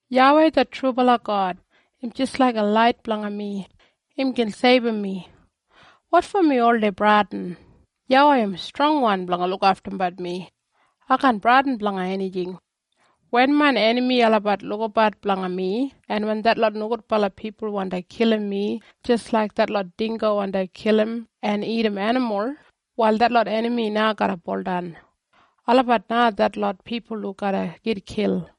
YAWEI det trubala God, im jis laiga lait blanga mi. Im gin seibum mi. Wotfo mi oldei bradin? YAWEI im strongwan blanga lukaftumbat mi. Ai kaan bradin blanga enijing. Wen main enami olabat lukabat blanga mi, en wen detlot nogudbala pipul wandi kilim mi jis laik detlot dinggo wandi kilim en dagat enimul, wal detlot enami na garra buldan. Olabat na detlot pipul hu garra gitkil.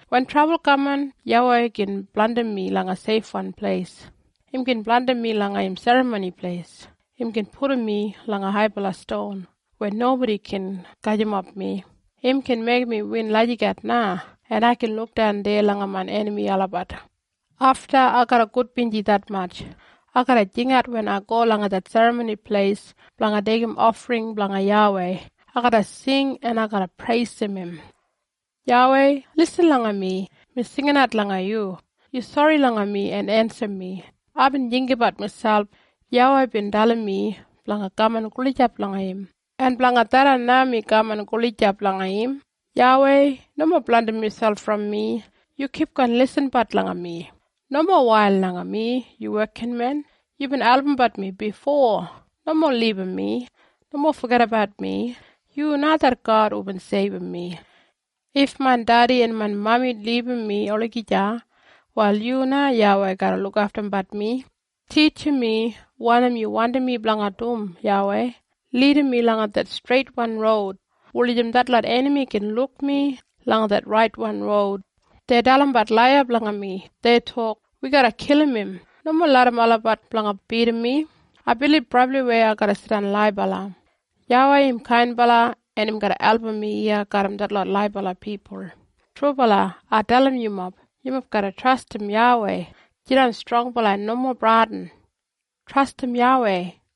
Wen trabul kaman, YAWEI gin blandim mi langa seifwan pleis. Im gin blandim mi langa im Serramoni Pleis. Im gin pudum mi langa haibala ston, weya nobodi kaan gajimap mi. Im gin meigim mi win lagijat na, en ai gin lukdan deya langa main enami olabat. Afta, ai garra gudbinji detmatj. Ai garra jingat wen ai go langa det Serramoni Pleis blanga deigim ofring blanga YAWEI. Ai garra sing en ai garra preisim im. YAWEI, lisin langa mi. Mi jinginat langa yu. Yu sori langa mi en ensim mi! Aibin jinggabat miselp, “YAWEI bin dalim mi blanga kaman gulijap langa im, en blanga tharran na mi kaman gulijap langa im.” YAWEI, nomo blandim miselp brom mi. Yu kipgon lisinbat langa mi. Nomo wail langa mi, yu wekinmen. Yubin albumbat mi bifo. Nomo libum mi. Nomo fogedabat mi. Yu na det God hubin seibum mi. If main dedi en main mami libum mi olagija, wal yu na YAWEI garra lukaftumbat mi. Titjim mi wanim yu wandim mi blanga dum, YAWEI. Lidim mi langa det streitwan roud, wulijim detlot enami gin luk mi langa det raitwan roud. Dei dalimbat ola laiya blanga mi. Dei tok, “Wi garra kilim im!” Nomo larram olabat blanga bidim mi! Ai bilib brabliwei ai garra jidan laibala. YAWEI im kainbala en im garra album mi iya garram detlot laibala pipul. Trubala, ai dalim yumob, yumob garra trastim YAWEI! Jidan strongbala en nomo bradin! Trastim YAWEI!